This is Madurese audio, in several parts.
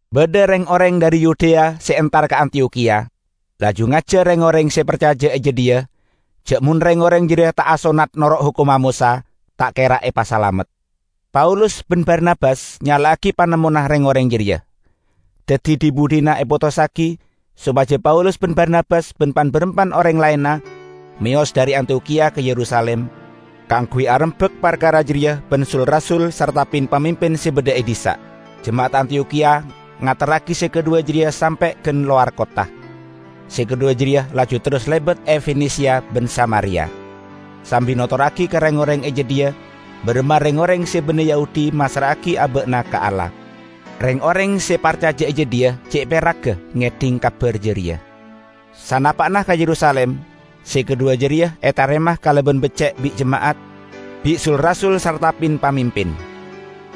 Badha reng-oreng dhari Yudea se entar ka Antiyokhiya, laju ngajar reng-oreng se parcaja e jadhiya ja' mon reng-oreng jareya ta' asonnat noro' hokomma Mosa, ta' kera epasalamet. Paulus ban Barnabas nyala'agi panemmona reng-oreng jareya. Daddi dhi-budhina epotossagi sopaja Paulus ban Barnabas ban pan-barampan oreng laenna meyos dhari Antiyokhiya ka Yerusalim kaangguy arembak parkara jareya ban sul-rasul sarta pin-pamimpin se badha e dhissa'. Jema'at Antiyokhiya ngaterragi se kadhuwa jareya sampe' gan lowar kottha; se kadhuwa jareya laju terros lebat e Fenesia ban Samaria, sambi notorragi ka reng-oreng e jadhiya baramma reng-oreng se banne Yahudi massra'agi aba'na ka Allah. Reng-oreng se parcaja e jadhiya ce' peragga ngedhing kabar jareya. Sanapa'na ka Yerusalim se kadhuwa jareya etarema kalaban becce' bi' jema'at, bi' sul-rasul sarta pin-pamimpin.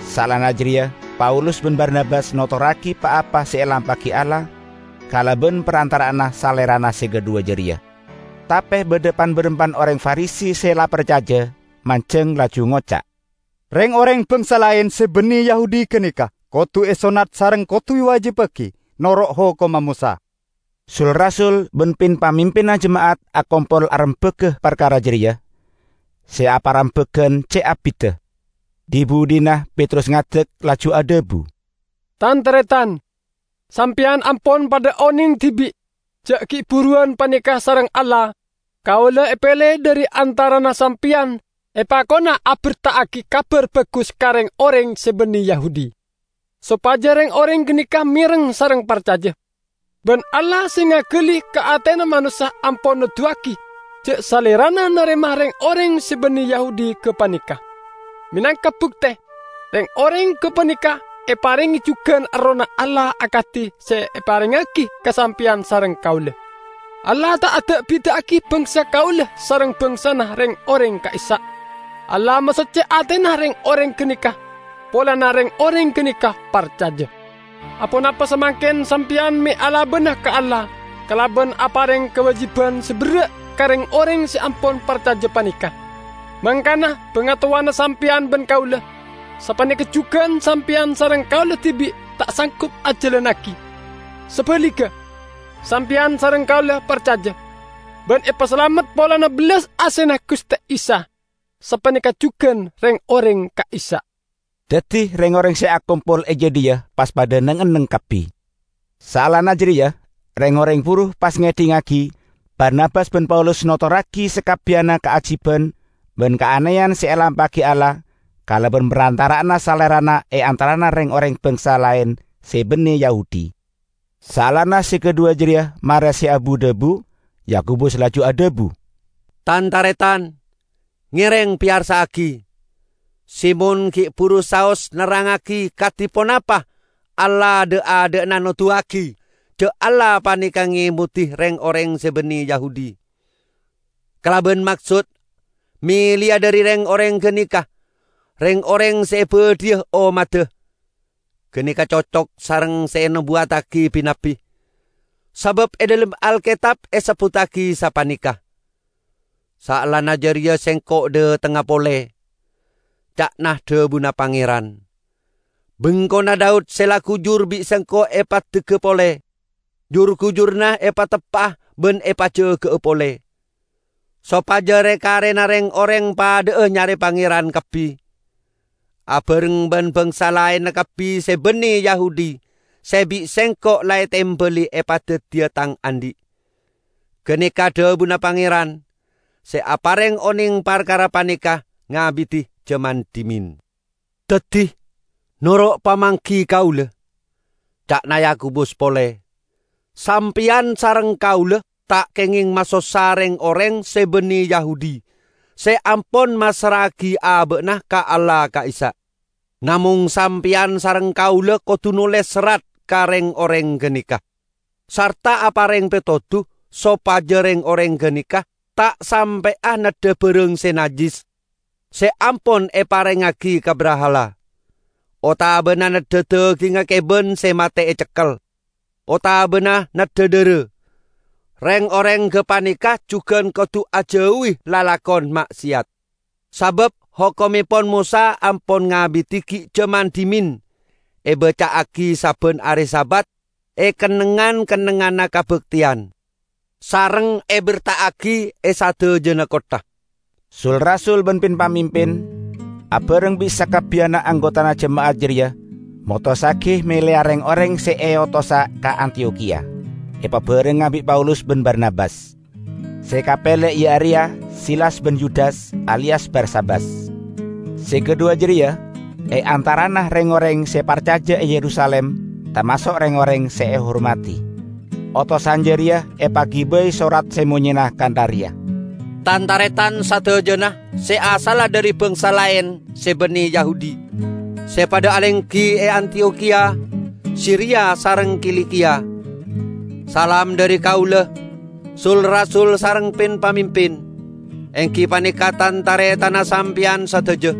Saellana jareya Paulus ban Barnabas notorragi pa-apa se elampa'agi Allah kalaban parantara'anna salerana se kadhuwa jareya. Tape badha pan-barampan oreng Farisi se la parcaja, manjeng laju ngoca', "Reng-oreng bangsa laen se banne Yahudi ganeka kodu esonnat sareng kodu ewajibbagi noro' hokomma Mosa." Sul-rasul ban pin-pamimpinna jema'at akompol arembaga parkara jareya. Se aparembagan ce' abidda. Dhi-budhina Petrus ngadek, laju adhabu, "Tan-taretan! Sampeyan ampon padha oneng dibi' ja' gi' buruwan paneka sareng Allah kaula epele dhari antarana sampeyan epakona aberta'agi Kabar Bagus ka reng-oreng se banne Yahudi, sopaja reng-oreng ganeka mereng sareng parcaja. Ban Allah se ngagali ka atena manossa ampon noduwagi ja' Salerana narema reng-oreng se banne Yahudi gapaneka; menangka bukte, reng-oreng gapaneka eparenge jugan Errohna Allah akadi se eparengngagi ka sampeyan sareng kaula. Allah ta' ada'-bida'agi bangsa kaula sareng bangsana reng-oreng ka'issa'. Allah masocce atena reng-oreng ganeka, polana reng-oreng ganeka parcaja. Aponapa samangken sampeyan me' alabana ka Allah kalaban apareng kawajiban se berra' ka reng-oreng se ampon parcaja paneka, mangkana bangatowana sampeyan ban kaula, sapaneka jugan sampeyan sareng kaula dibi', ta' sanggup ajalannagi? Sabaligga, sampeyan sareng kaula parcaja, ban epasalamet polana bellas asena Guste Isa; sapaneka jugan reng-oreng ka'issa'." Daddi reng-oreng se akompol e jadhiya pas padha neng-enneng kabbi. Saellana jareya reng-oreng buru pas ngedhingngagi Barnabas ban Paulus notorragi sakabbiyanna kaajiban ban kaaneyan se elampa'agi Allah kalaban parantara'anna salerana e antarana reng-oreng bangsa laen se banne Yahudi. Saellana se kadhuwa jareya mare se abu-dhabu, Yakobus laju adhabu, "Tan-taretan! Ngereng peyarsa'agi. Simon gi' buru saos nerrangngagi kadi ponapa Allah dha'-adha'na noduwagi ja' Allah paneka ngemodi reng-oreng se banne Yahudi, kalaban maksod meleya dhari reng-oreng ganeka reng-oreng se ebadhiya ommadda. Ganeka cocok sareng se enobuwattagi bi-nabbi. Sabab e dhalem Alketab esebbuttagi sapaneka, 'Saellana jareya Sengko' dhatengnga pole,' ca'na dhabuna Pangeran, 'bengkona Daud se la gujur bi' Sengko' epaddegga pole, jur-gujurranna epateppa'a ban epajaga'a pole; sopaja re-karena reng-oreng padha'a nyare Pangeran kabbi, abareng ban bangsa laenna kabbi se banne Yahudi se bi' Sengko' la etembali epadaddiya Tang andhi'.' Ganeka dhabuna Pangeran, se apareng oneng parkara paneka ngabidi jaman dhimen." "Daddi, noro' pamanggi kaula," ca'na Yakobus pole, "sampeyan sareng kaula ta' kengeng masossa reng-oreng se banne Yahudi se ampon massra'agi aba'na ka Allah ka'issa'. Namong sampeyan sareng kaula kodu noles serrat ka reng-oreng ganeka, sarta apareng petodu sopaja reng-oreng ganeka ta' sampe'a neddha barang se najjis se ampon eparengngagi ka brahala, otabana neddha dagingnga keban se mate ecekkel, otabana neddha dhara. Reng-oreng gapaneka jugan kodu ajauwi lalakon ma'seyat. Sabab hokommepon Mosa ampon ngabidi gi' jaman dhimen ebaca'agi sabban are Sabat e kennengngan-kennengnganna kabakteyan, sareng eberta'agi e sadajana kottha." Sul-rasul ban pin-pamimpin, abareng bi' sakabbiyanna anggotana jema'at jareya motossagi meleya reng-oreng se eotosa ka Antiyokhiya epabarengnga bi' Paulus ban Barnabas. Se kapele iya areya Silas ban Yudas aliyas Barsabas. Se kadhuwa jareya e antarana reng-oreng se parcaja e Yerusalim tamaso' reng-oreng se ehormadi. Otosan jareya epagibai sorat se monyena kantha reya, "Tan-taretan sadajana se asalla dhari bangsa laen se banne Yahudi, se padha alenggi e Antiyokhiya, Siria sareng Kilikiya. Salam dhari kaula, sul-rasul sareng pin-pamimpin, enggi paneka tan-taretanna sampeyan sadaja.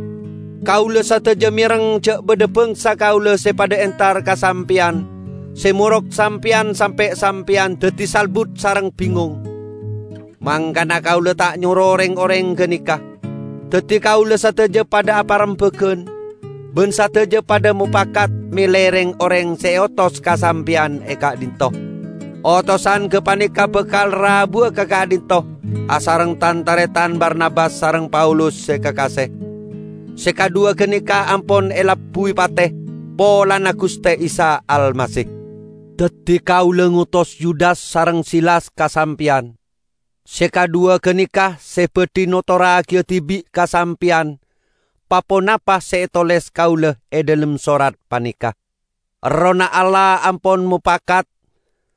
Kaula sadaja mereng ja' badha bangsa kaula se padha entar ka sampeyan se morok sampeyan sampe' sampeyan daddi salbut sareng bingong. Mangkana kaula ta' nyoro reng-oreng ganeka. Daddi kaula sadaja padha aparembagan, ban sadajana padha mopakat mele reng-oreng se eotos ka sampeyan e ka'dhinto'. Otosan gapaneka bakal rabuwa ka ka'dhinto' asareng tan-taretan Barnabas sareng Paulus se kakase. Se kadhuwa ganeka ampon alabbuwi pate polana Guste Isa Almasih. Daddi kaula ngotos Yudas sareng Silas ka sampeyan. Se kadhuwa ganeka se badhi notorragi dibi' ka sampeyan pa-ponapa se etoles kaula e dhalem sorat paneka. Errohna Allah ampon mopakat --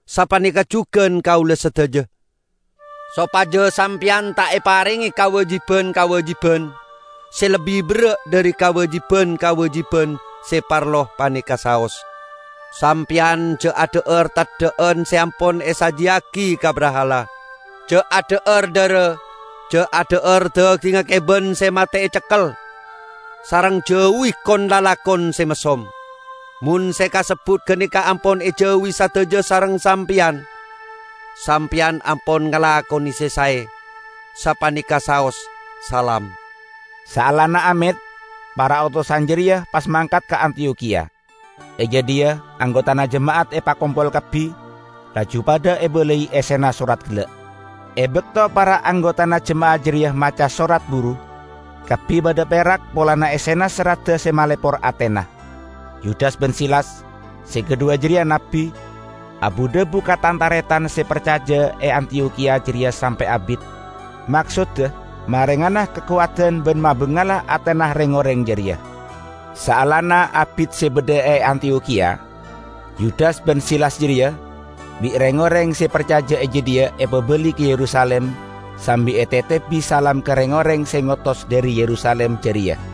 sapaneka jugan kaula sadaja -- sopaja sampeyan ta' eparenge kawajiban-kawajiban se lebbi berra' dhari kawajiban-kawajiban se parlo paneka saos: sampeyan ja' adha'ar teddha'an se ampon esajiyagi ka brahala; ja' adha'ar dhara, ja' adha'ar dagingnga keban se mate ecekkel, sareng jauwi kon-lalakon se messom. Mon se kasebbut ganeka ampon ejauwi sadaja sareng sampeyan, sampeyan ampon ngalakone se sae. Sapaneka saos. Salam!" Saellana amet, para otosan jareya pas mangkat ka Antiyokhiya. E jadhiya anggotana jema'at epakompol kabbi, laju padha ebalai essena sorat gella'. E bakto para anggotana jema'at jareya maca sorat buru, kabbi padha perak polana essena soradda se malepor atena. Yudas ban Silas, -- se kadhuwa jareya nabbi, abu-dhabu ka tan-taretan se parcaja e Antiyokhiya jareya sampe' abit, maksodda marengana kakowadan ban mabangala atena reng-oreng jareya. Saellana abit se badha e Antiyokhiya, Yudas ban Silas jareya bi' reng-oreng se parcaja e jadhiya epabali ka Yerusalim sambi etetebi salam ka reng-oreng se ngotos dhari Yerusalim jareya. [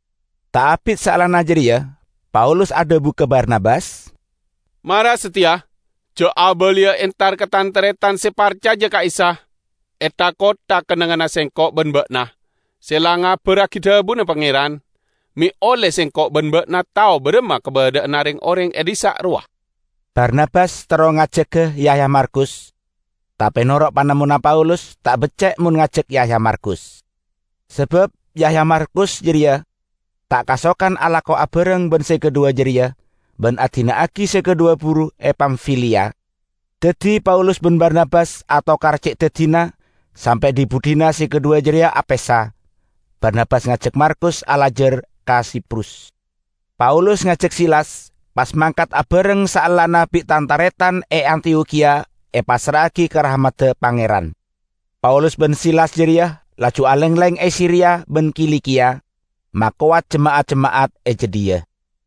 Ta' abit saellana jareya Paulus adhabu ka Barnabas, "Mara sateya ja' abaliya entar ka tan-taretan se parcaja ka Isa e tha-kottha kennengnganna sengko' ban ba'na se la ngabarragi dhabuna Pangeran, me' olle sengko' ban ba'na tao baramma kabadha'anna reng-oreng e dhissa' rowa." Barnabas terro ngajaga Yahya Markus, tape noro' panemmona Paulus ta' becce' mon ngajak Yahya Markus, sabab Yahya Markus jareya ta' kasokan alako abareng ban se kadhuwa jareya, ban adina'agi se kadhuwa buru e Pamfiliya. Daddi Paulus ban Barnabas atokar ce' daddina sampe' dhi-budhina se kadhuwa jareya apesa: Barnabas ngajak Markus alajar ka Siprus. Paulus ngajak Silas pas mangkat abareng saellana bi' tan-taretan e Antiyokhiya epassra'agi ka rahmadda Pangeran. Paulus ban Silas jareya laju alengleng e Siria ban Kilikiya, makowat jema'at-jema'at e jadhiya.